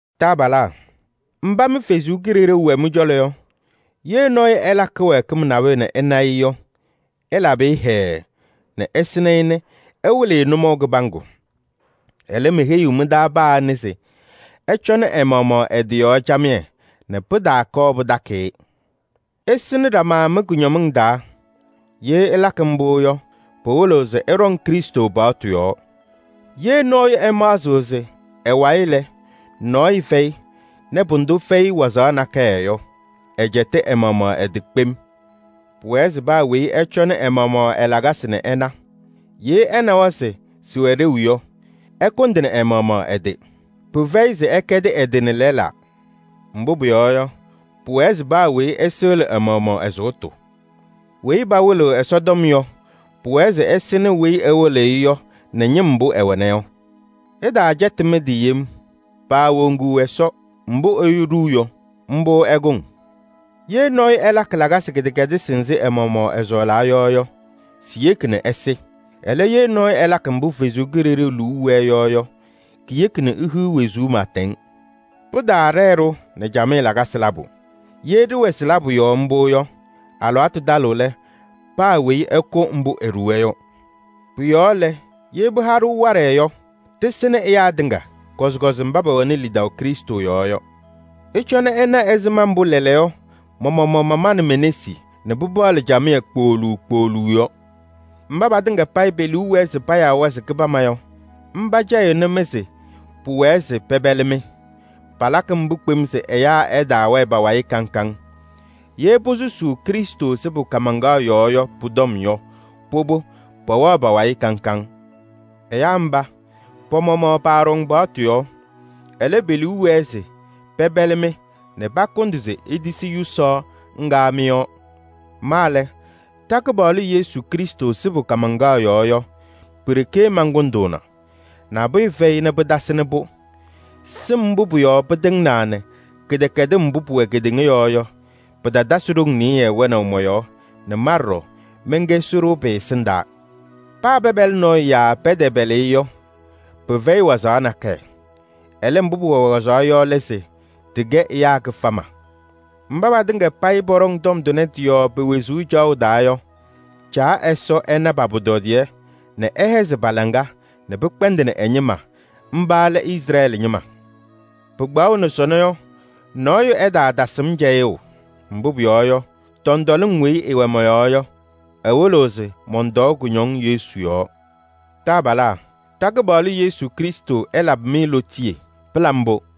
Taabalaa! Mba mɩ Ɛsɔ Kalɩzaɣ wɛ mɩ-cɔlɔ yɔ, ye nɔɔyʋ ɛlakɩ kɩwɛɛkɩm nabʋyʋ nɛ ɩna-ɩ yɔ, ɩlabɩ-ɩ hɛɛɛ nɛ ɩsɩnɩ-ɩ nɛ ɩwɩlɩ-ɩ nʋmɔʋ kɩbaŋgʋ. Ɛlɛ, meheyiɣ mɩ-taa paa anɩ se ɛcɔnɩ ɛ-maɣmaɣ ɛ-tɩ yɔɔ camɩyɛ nɛ pɩtaakɔɔ pɩtakɩ-ɩ. Ɩsɩnɩ ɖama mɩ-kʋñɔmɩŋ taa. Ye ɩlakɩ mbʋ yɔ, pɩwɩlɩɣ se ɩɖɔŋ Krɩstʋ paɣtʋ yɔɔ. Ye nɔɔyʋ ɛmaɣzɩɣ se ɛ-wayɩ lɛ, nɔɔyʋ fɛyɩ nɛ pʋdʋ fɛyɩ wazaɣ nakɛyɛ yɔ, ɛcɛtɩ ɛ-maɣmaɣ ɛ-tɩ kpem. Pʋwɛɛ se paa weyi ɛcɔnɩ ɛ-maɣmaɣ ɛ-lakasɩ nɛ ɛna. Ye ɛnawa se sɩwɛ ɖeu yɔ, ɛkʋndɩnɩ ɛ-maɣmaɣ ɛ-tɩ. Pɩfɛyɩ se ɛkɛdɩ ɛ-tɩ nɛ lɛlaa. Mbʋ pʋyɔɔ yɔ, pʋwɛɛ se paa weyi ɛsɩɣlɩ ɛ-maɣmaɣ ɛ-sʋʋtʋ. Weyi pawɩlɩɣ Ɛsɔtɔm yɔ, pʋwɛɛ se ɛsɩnɩ weyi ɛwɩlɩɣ-ɩ yɔ nɛ ñɩm mbʋ ɛwɛna yɔ. Ɩtaacɛtɩ mɩ-tɩ yem: paawoŋuu Ɛsɔ. Mbʋ ɛyʋ ɖuu yɔ, mbʋ ɛkʋŋ: ye nɔɔyʋ ɛlakɩ lakasɩ kɩdɛkɛdɩsɩ nzɩ ɛ-maɣmaɣ ɛsɔɔlaa yɔ yɔ, siyeki nɛ ɛsɩ. Ɛlɛ, ye nɔɔyʋ ɛlakɩ mbʋ Ɛsɔ Kalɩzaɣ liu wɛɛ yɔ yɔ, keyeki nɛ ehiɣ wezuu pɩɩtɛŋ. Pɩtaaɖɛɛ-ɖʋ nɛ camɩyɛ lakasɩ labʋ. Ye ɖɩwɛ sɩ-labʋ yɔɔ mbʋ yɔ, alɩwaatʋ talɩɣ lɛ, paa weyi ɛkʋ mbʋ eɖuwa yɔ. Pʋ-yɔɔ lɛ, ye pɩha-ɖʋ waɖɛ yɔ, ɖɩsɩnɩ ɛyaa tɩŋa, kɔzɩkɔzɩ mba pɛwɛnɩ lidaʋ Krɩstʋ yɔɔ yɔ. Ɩcɔnɩ ɩna ɛzɩma mbʋ lɛɛlɛɛyɔ ma-maɣmaɣ mamanɩ me-nesi nɛ pɩpaɣlɩ camɩyɛ kpooluu kpooluu yɔ. Mba patɩŋa payɩ pe-liu wɛɛ se payaa-wɛ se kɩbama yɔ, mba cɛyɩɣnɩ-mɩ se pʋwɛɛ se pɛpɛlɩ-mɩ. Palakɩ mbʋ kpem se ɛyaa ɛtaawɛɛ pa-wayɩ kaŋ kaŋ. Ye posusuu Krɩstʋ sɩbʋ kaamaŋkaɣ yɔɔ yɔ pʋ-tɔm yɔ, pʋbʋ, pɛwɛɣ pa-wayɩ kaŋ kaŋ. Ɛyaa mba, pa-maɣmaɣ paaɖɔŋ paɣtʋ yɔɔ. Ɛlɛ, pe-liu wɛɛ se pɛpɛlɩ-mɩ nɛ pakʋndɩ se itisi yʋsaɣ ŋga mɩ-yɔɔ. Ma lɛ, ɖa-Kɩpaɣlʋ Yesu Krɩstʋ sɩbʋ kaamaŋkaɣ yɔɔ yɔ, pi-ɖeke mankʋndʋʋna, nabʋyʋ fɛyɩ nɛ pɩtasɩnɩ-pʋ. Sɩm mbʋ pʋ-yɔɔ pɩtɩŋnaa nɛ kɩdɛkɛdɩm mbʋ pʋwɛ kedeŋa yɔɔ yɔ, pɩtatasɩ ɖoŋ nɩyɩɩ wɛnaʋ mɔ-yɔɔ nɛ ma ɖɔɖɔ mɛnkɛ sɩɖʋ pɩ-ɛsɩndaa. Paa pɛpɛlɩ nɔɔyʋ yaa pɛtɛpɛlɩ-ɩ yɔ, pɩfɛyɩ wazaɣ nakɛyɛ. Ɛlɛ, mbʋ pʋwɛ wazaɣ yɔ lɛ se: ɖɩkɛ ɛyaa kɩfama. Mba patɩŋa payɩ pɔɖɔŋ tɔm tʋnɛ tɩ-yɔɔ pe-wezuu caɣʋ taa yɔ, Caa Ɛsɔ ɛna pa-pʋtɔdɩyɛ nɛ ɛhɛzɩ pa-laŋa nɛ pɩkpɛndɩnɩ ɛ-ñɩma, mba lɛ Izrɛɛlɩ ñɩma! Pɩkpaɣʋnɩ sɔnɔ yɔ, nɔɔyʋ ɛtaatasɩ-m cɛyʋʋ, mbʋ pʋyɔɔ yɔ, tɔntɔlɩŋ weyi ɩwɛ mɔ-yɔɔ yɔ, ɩwɩlɩɣ se mɔntɔɔ kʋñɔŋ Yesu yɔɔ. Taabalaa! Ɖa-Kɩpaɣlʋ Yesu Krɩstʋ ɛlabɩ-mɩ lootiye! Pɩla mbʋ!